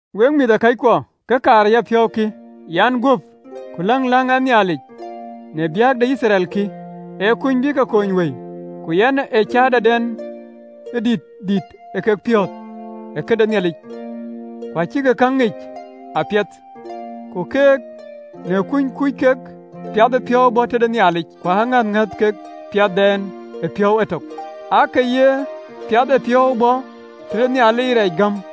Wek mïthëkɔckuɔ, kë kaar ë yapiɔ̈u kï, yɛn guöp, ku läŋ ɛn Nhialic në biäk de Yithriɛl kï, ee kuny bï ke kony wëi. Ku yɛn ee cäätɔden ë dït dïït kek piɔ̈ɔ̈th ë këde Nhialic, ku acïkï käŋ ŋic apiɛth. Ku keek, në kuny kuc kek piathëpiɔ̈u bɔ̈ tëde Nhialic, ku ŋäth ŋɛ̈ɛ̈th kek piathdɛn ë piɔ̈u etök, aake ye piathëpiɔ̈u bɔ̈ tëde Nhialic rɛɛc gam.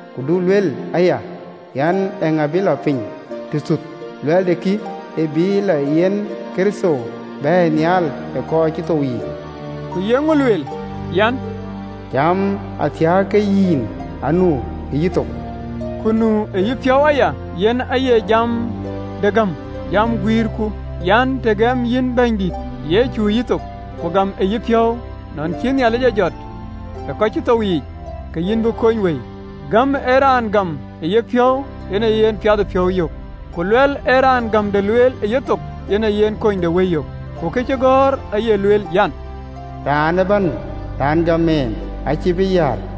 Ku du luel aya an, “Eeŋa bï lɔ piny tëthuth?” (Luɛɛlde kï, ee bïï le yen Kërtho bɛ̈ɛ̈i nhial ë kɔc cïï thou yiic). Ku ye ŋö lueel? An, “Jam athiääk ke yïn, anu ë yïthok, ku nu ë yïpiɔ̈u aya.” Yen aye jam de gäm, jam guiirku. Të gɛm yïn Bɛ̈nydït Yecu ë yïthok, ku gam ë yïpiɔ̈u, nɔn cï Nhialic e jɔt ë kɔc cï thou yiic, ke yïn bï kony wëi. Gäm ee raan gam ë yepiɔ̈u yen aye yen piathëpiɔ̈u yök, ku luɛɛl ee raan gämde lueel ë yethok yen aye yen kunydewëi yök. (LXX). Ku këcïgɔ̈ɔ̈r aye lueel an, “Raan ëbɛ̈n raan gam en acïï bï yäär.”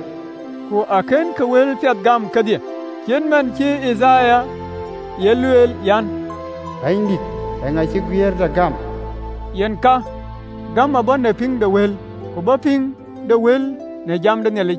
(LXX). Ku akënkï wëlpiɛth gam kedhie, cït man cï Yithaya ye lueel an, “Bɛ̈nydït, eeŋa cï guiëërda gam?” Yen ka, Gäm abɔ̈ në pïŋ de wël, ku bɔ̈ pïŋ de wël në Kërtho.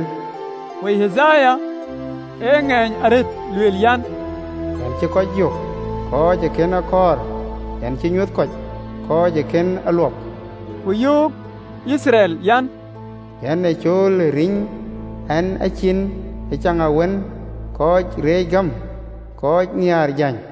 (LXX). Ku Yithaya ë ŋeeny arëët lueel an: “Yɛn cïï kɔc yök, kɔc ë kën a kɔɔr, Yɛn cï rɔ nyuöth kɔc, kɔc ë kën a luɔp.” (LXX). Ku yöök Yithriɛl an, “Yɛn ee cool ë riɛny ɛn a cin ë caŋawën ë kɔc reec gäm, kɔc nhiaar jäny.”